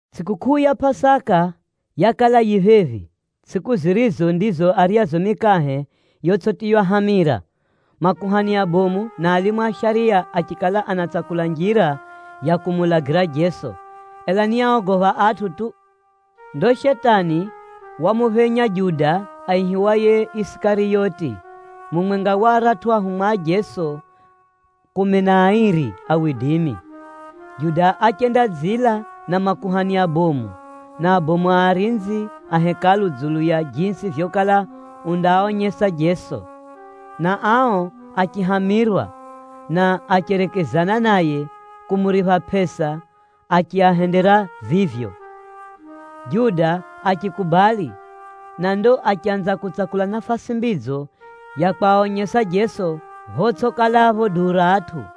Tsʼikukʼuu ya Pʼasaka yakala yifika phephi, tsʼiku zirizo ndizo aryazo mikahe yotsʼitiywa hamira. Makuhani abomu na alimu a shariya achikala anatsakula njira ya kumuulagira Jeso, ela ni áogopha atʼu tu. Ndo Shetani wamuphenya Juda aihiwaye Isikariyoti, mumwenga wa aratʼu ahumwa a Jeso kumi na airi. Juda achendadzila na makuhani abomu na abomu arinzi a Hekalu dzulu ya jisi vyokala undaaonyesa Jeso. Na ao achihamirwa, na acherekezana naye kumuripha pʼesa achiahendera vivyo. Juda achikubali, na ndo achanza kutsakula nafasi mbidzo ya kwaonyesa Jeso photsʼikalapho duu ra atʼu.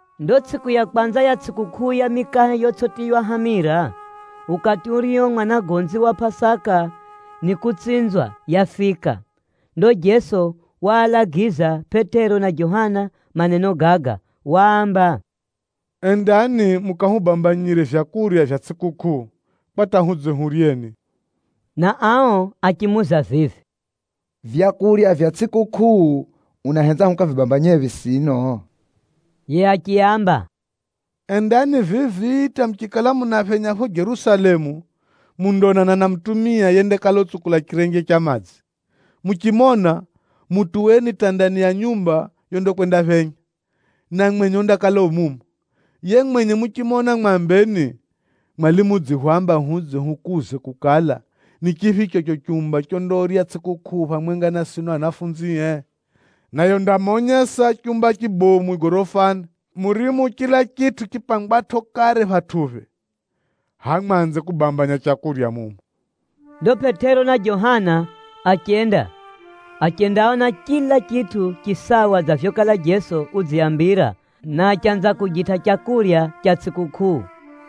Ndo tsʼiku ya kwanza ya tsʼikukʼuu ya mikahe yotsʼitiywa hamira, ukati urio mwanagonzi wa Pʼasaka nikutsinzwa, yafika. Ndo Jeso waalagiza Pʼetero na Johana maneno gaga. Waamba, “Endani mukahubambanyire vyakurya vya tsʼikukʼuu, kwa hata hudze huryeni.” Na ao achimuuza vivi, “Vyakurya vya tsʼikukʼuu, unahenza hukavibambanyephi sino?” Yiye achiaamba, “Endani vivi hata muchikala munaphenya phapho Jerusalemu, mundaonana na mutumia yendakala utsukula chirenje cha madzi. Muchimona, mutuweni hata ndani ya nyumba yondakwendaphenya, na mwenye undakala yu mumo. Yiye mwenye muchimona mwambeni, ‘Mwalimu udzihwamba hudze hukuuze kukala, ni chiphicho chicho chumba chondarya tsʼikukʼuu phamwenga na sino ahumwae?’ Naye undamonyesa chumba chibomu gorofani, murimo chila chitʼu chipangwatʼo kare phatʼuphe. Hʼaya mwanze kubambanya leu mumo.” Ndo Pʼetero na Johana achenda, achendaona chila chitʼu chisawa dza vyokala Jeso udziaambira, na achanza kujitʼa leu ra tsʼikukʼuu.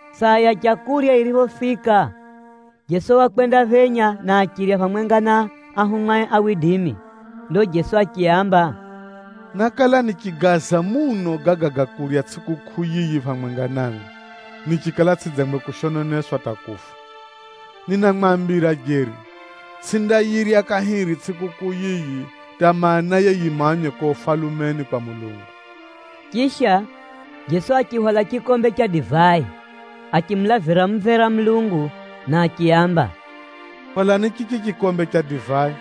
Saa ya leu yiriphofika, Jeso wakwendaphenya na achirya phamwenga na ahumwae. Ndo Jeso achiaamba, “Nákala nichigaaza muno gaga ga kurya tsʼikukʼuu yiyi phamwenga namwi nichikala tsʼidzangwe kushononeswa hata kufa. Ninamwambira jeri, tsʼindayirya kahiri tsʼikukʼuu yiyi hata maanaye yimanywe kuko Ufalumeni kwa Mulungu.” Chisha, Jeso achihwala chikombe cha divai, achimulavira mumvera Mulungu na achiaamba, “Hwalani chichi chikombe cha divai,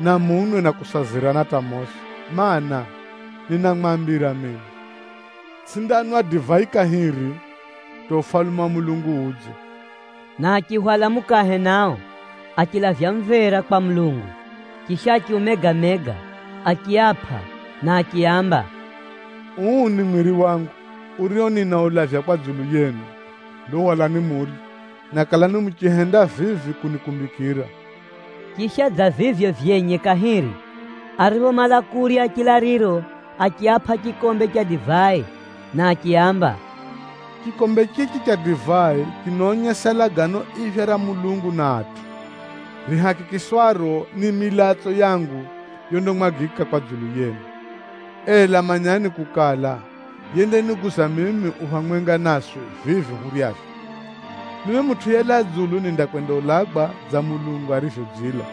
na munwe na kusazirana hata mosi. Maana, ninamwambira mino, tsʼindanwa divai kahiri hata Ufalume wa Mulungu udze.” Na achihwala mukahe nao, achilavya mumvera kwa Mulungu, chisha achiumega-mega, achiapʼa na achiaamba, “Uu ni mwiri wangu, urio ninaulavya kwa dzulu yenu. Ndo hwalani murye, na kalani muchihenda vivi kunikumbikira.” Chisha dza vivyo vyenye kahiri, ariphomala kurya chilaliro achiapʼa chikombe cha divai na achiaamba, “Chikombe chichi cha divai chinaonyesa Lagano Iphya ra Mulungu na atʼu, rihakikishwaro ni milatso yangu yondamwagwa kwa dzulu yenu. “Ela manyani kukala, yendaniguza mimi u phamwenga naswi vivi huryavyo. Mimi Mutʼu yelaa dzulu nindakwendaulagwa dza Mulungu arivyodzila.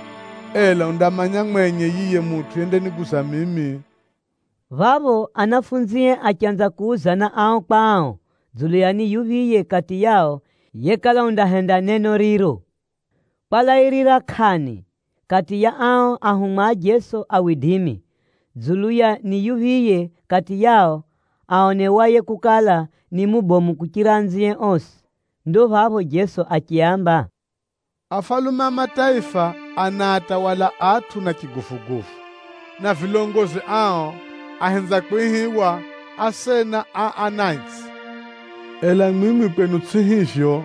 Ela undamanya mwenye yiye mutʼu yendaniguza mimi.” Phapho ahumwae achanza kuuzana ao kwa ao dzulu ya ni yuphiye kati yao yekala undahenda neno riro. Kwalairira kʼani kati ya ao ahumwa a Jeso, dzulu ya ni yuphiye kati yao aonewaye kukala, ni mubomu kuchira anzie osi. Ndo phapho Jeso achiaamba, “Afalume a mataifa anaatawala atʼu na chiguvuguvu, na vilongozi ao ahenza kwihiwa, ‘Asena a anatsʼi.’ Ela mwimwi kwenu tsʼivyo hivyo,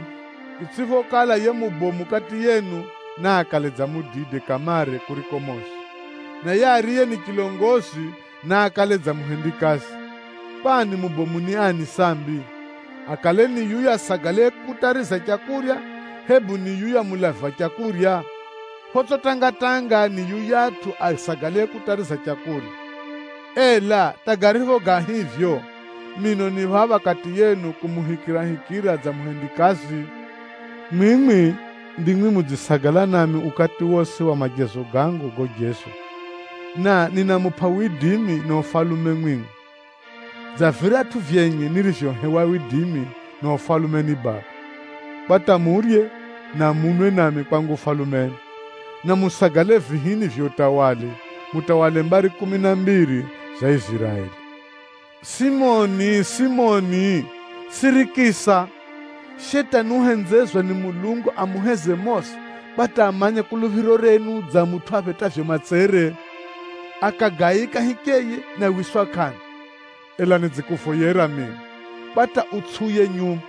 itsʼiphokala yiye mubomu kati yenu naakale dza mudide kamare kuriko mosi, na yiye ariye ni chilongozi, naakale dza muhendikazi. Kwani mubomu ni ani sambi? Akale ni yuyatʼu asagalaye kutariza leu, hebu ni yuyatʼu mulavi wa leu? Photsʼi tanga-tanga, ni yuyatʼu asagalaye kutariza leu! Ela hata garipho ga hivyo, mino ni phapha kati yenu kumuhikirahikira dza muhendikazi. “Mwimwi ndimwi mudzisagala nami ukati wosi wa majezo gangu gojezwa, na ninamupʼa widimi na ufalume mwimwi, dza viratʼu vyenye nirivyohewa widimi na ufalume ni Baba, kwa hata murye na munwe nami kwangu Ufalumeni, na musagale vihini vya utawala, mutawale mbari kumi na mbiri za Iziraeli. “Simoni, Simoni! Sirikisa! Shetani uhenzezwa ni Mulungu amuheze mosi kwa hata amanye kuluphiro renu dza mutʼu aphetʼavyo matsere, akagaika hicheye na wiswa kʼanda. Ela nidzikuvoyera mino kwa hata utsʼiuye nyuma.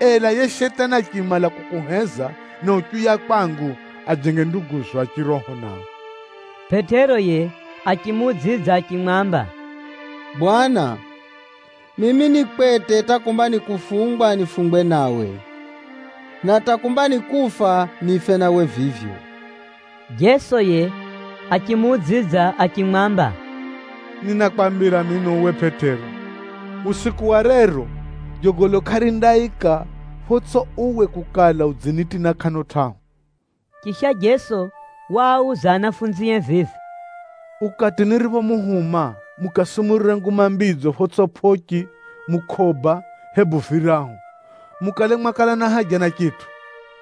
Ela yiye Shetani achimala kukuheza na uchiuya kwangu, ajenge nduguzo a chiroho nao.” Pʼetero yiye achimuudzidza achimwamba, “Bwana, mimi ni kwete hata kumba ni kufungwa nifungwe nawe, na hata kumba ni kufa nife nawe vivyo.” Jeso yiye achimuudzidza achimwamba, “Ninakwambira mino uwe Pʼetero, usiku wa rero jogolo kʼarindaika photsʼipho uwe kukala udzinitina kʼano tʼahu!” Chisha Jeso waauza ahumwae vivi, “Ukati niriphomuhuma mukasumurire Nguma Mbidzo photsʼipho pʼochi, mukʼoba, hebu virahu, mukale mwakala na haja na chitʼu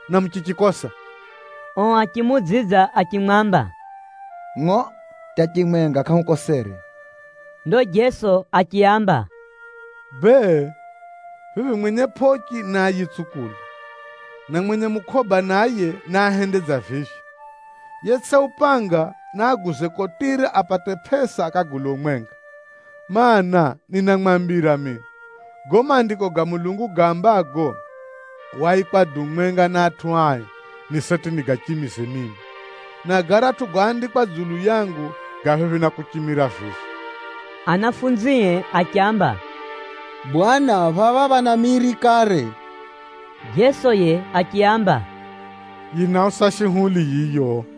na muchichikosa?” Ao achimuudzidza achimwamba, “Ngʼo, hata chimwenga kʼahukosere.” Ndo Jeso achiaamba, “Bee, vivi mwenye pʼochi naayitsukule, na mwenye mukʼoba naye, naahende dza vivyo. Yetsʼina upanga, naaguze kotire apate pʼesa akagule umwenga. Maana, ninamwambira mino, gago Maandiko ga Mulungu gaambago, ‘Waikwa duu mwenga na atʼu ai,’ ni seti nigachimize mimi, na garatʼu goandikwa dzulu yangu, ga phephi na kuchimira vivi.” Ahumwae achiamba, “Bwana phapha phana miri kare.” Jeso yiye achiaamba, “Yinausa shuhuli yiyo.”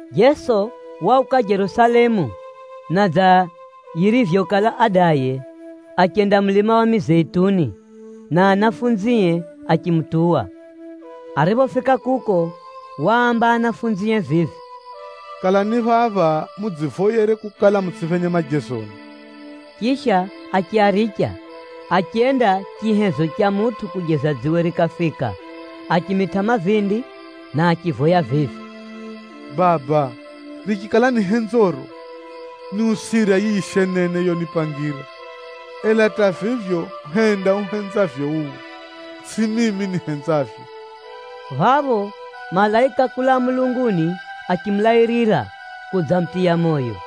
Jeso wauka Jerusalemu na dza yirivyokala adaye, achenda mulima wa Mizeituni, na ahumwae achimutuwa. Ariphofika kuko, waamba ahumwae vivi, “Kalani phapha mudzivoyere kukala mutsʼiphenye majezoni.” Chisha achiaricha, achenda chihezo cha mutʼu kujeza dziwe rikafika, achimitʼa mavindi na achivoya vivi: “Baba, richikala ni henzoro, niusira yiyi shenene yonipangira. Ela hata vivyo henda uhenzavyo uwe, tsʼihivyo mimi nihenzavyo.” Phapho malaika kulaa mulunguni achimulairira kudzamutiya moyo.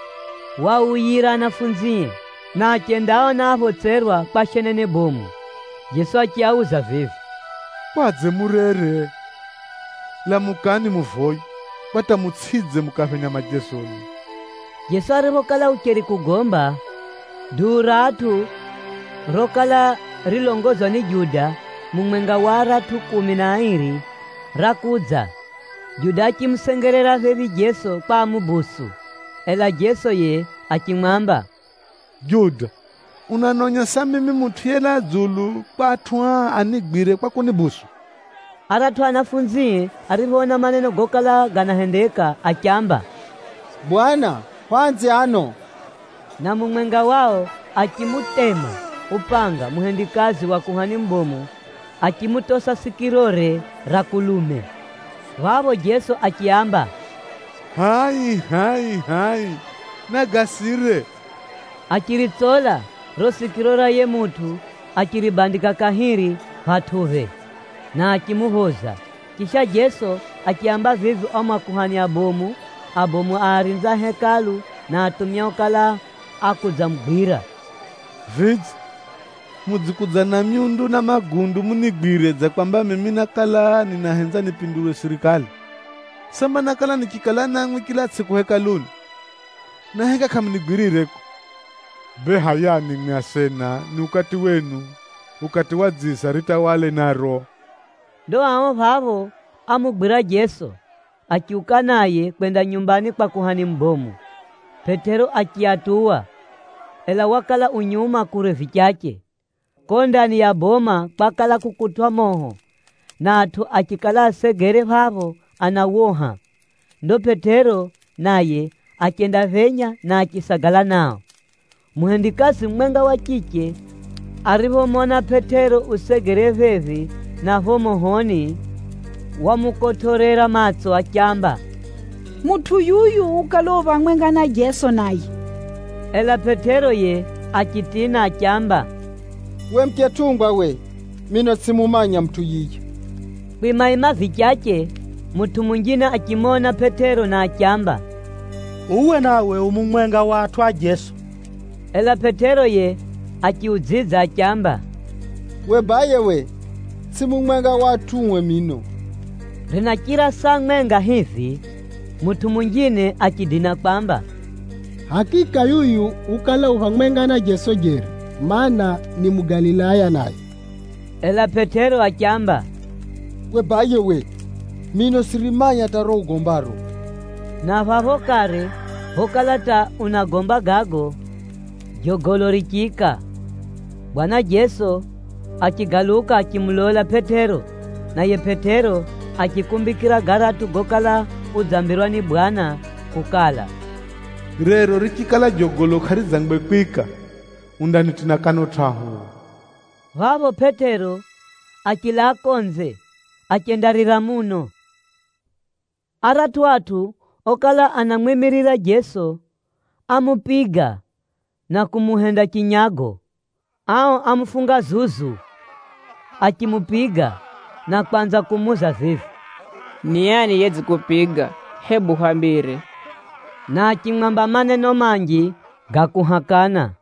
Ariphomala mavoyoge, waauyira ahumwae, na achendaaona aphotserwa kwa shenene bomu. Jeso achiauza vivi, “Kwadze murere? Lamukani muvoye, kwa hata mutsʼidze mukaphenya majezoni.” Jeso ariphokala ucheri kugomba, duu ra atʼu rokala rilongozwa ni Juda mumwenga wa aratʼu kumi na airi, rakudza. Juda achimusengerera phephi Jeso kwa amudonere. Ela Jeso yiye achimwamba, “Juda, unanonyesa mimi Mutʼu yelaa dzulu kwa atʼu aa anigwire kwa kunibusu?” Aratʼu ahumwae ariphoona maneno gokala ganahendeka, achiamba, “Bwana, hwaanze ano?” Na mumwenga wao achimutema upanga muhendikazi wa kuhani mubomu achimutosa sikirore ra kulume. Phapho Jeso achiaamba, “Hʼai hʼai hʼai! Nagasire.” Achiritsola riro sikiro ra yiye mutʼu achiribandika kahiri phatʼuphe, na achimuphoza. Chisha Jeso achiaamba vivi ao makuhani abomu, abomu a arinzi a Hekalu na atumia okala akudzamugwira, “Vidze, mudzikudza na myundu na magundu munigwire dza kwamba mimi nákala ninahenza nipinduwe sirikali? Samba nákala nichikala namwi chila tsʼiku Hekaluni, na heka kʼamunigwirire kuko? Bee hʼayani mwimwi asena ni ukati wenu, ukati wa dziza ritawale naro.” Ndo ao phapho ámugwira Jeso, achiuka naye kwenda nyumbani kwa kuhani mubomu. Pʼetero achiatuwa, ela wakala u nyuma kure vichache. Kuko ndani ya boma kwakala kukutwʼa moho, na atʼu achikala asegere phapho anawoha. Ndo Pʼetero naye achendaphenya na achisagala nao. Muhendikazi mumwenga wa chiche ariphomona Pʼetero usegere phephi na phapho mohoni, wamukotʼorera matso achiamba, “Mutʼu yuyu ukala u phamwenga na Jeso naye.” Ela Pʼetero yiye achitina achiamba, “Uwe muchetʼungwa uwe, mino tsʼimumanya mutʼu yiye.” Kwimaima vichache, mutʼu munjine achimona Pʼetero na achiamba, “Uwe nawe u mumwenga wa atʼu a Jeso.” Ela Pʼetero yiye achiudzidza achiamba, “Uwe baye uwe, tsʼimi mumwenga wa atʼue mino!” Rinachira saa mwenga hivi, mutʼu munjine achidina kwamba, “Hakika yuyu ukala u phamwenga na Jeso jeri, mana, ni Mugalilaya naye.” Ela Pʼetero achiamba, “Uwe baye uwe, mino tsʼirimanya hata riro ugombaro!” Na phapho kare phokala hata unagomba gago, jogolo richiika. Bwana Jeso achigaluka achimulola Pʼetero, naye Pʼetero achikumbikira garatʼu gokala udzambirwa ni Bwana kukala, “Rero richikala jogolo kʼaridzangwe kwika, undanitina kʼano tʼahu uwe.” Phapho Pʼetero achilaa konze, achendarira muno. Aratʼu atʼu okala anamwimirira Jeso, ámupiga na kumuhenda chinyago. Ao ámufunga zuzu. Achimupiga na kwanza kumuuza vivi, “Ni ani yedzikupiga? Hebu hwambire!” Na achimwamba maneno manji ga kuhakana.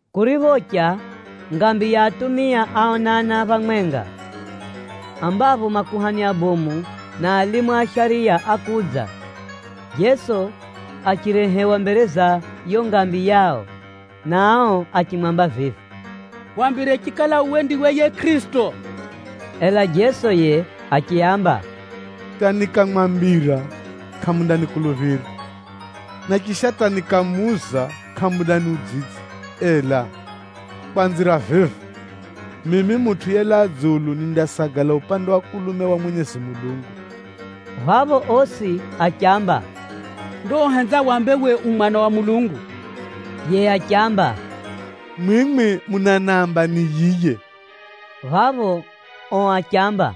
Kuriphocha, ngambi ya atumia áonana phamwenga, ambapho makuhani abomu na alimu a shariya ákudza. Jeso achirehewa mbere za yiyo ngambi yao. Na ao achimwamba vivi, “Hwambire chikala uwe ndiwe yiye Kʼirisito.” Ela Jeso yiye achiaamba, “Hata nikamwambira kʼamundanikuluphira, na chisha hata nikamuuza kʼamundaniudzidza. Ela kwanzira vivi, mimi Mutʼu yelaa dzulu nindasagala mukono wa kulume wa Mwenyezi Mulungu.” Phapho osi achiamba, “Ndo uhenza wambe uwe u Mwana wa Mulungu!” Yiye achiamba, “Mwimwi munaniamba ni yiye.” Phapho ao achiamba,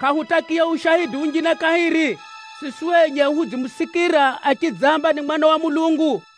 “Kʼahutakiya ushaidi unjine kahiri, siswi enye hudzimusikira achidzamba ni Mwana wa Mulungu.”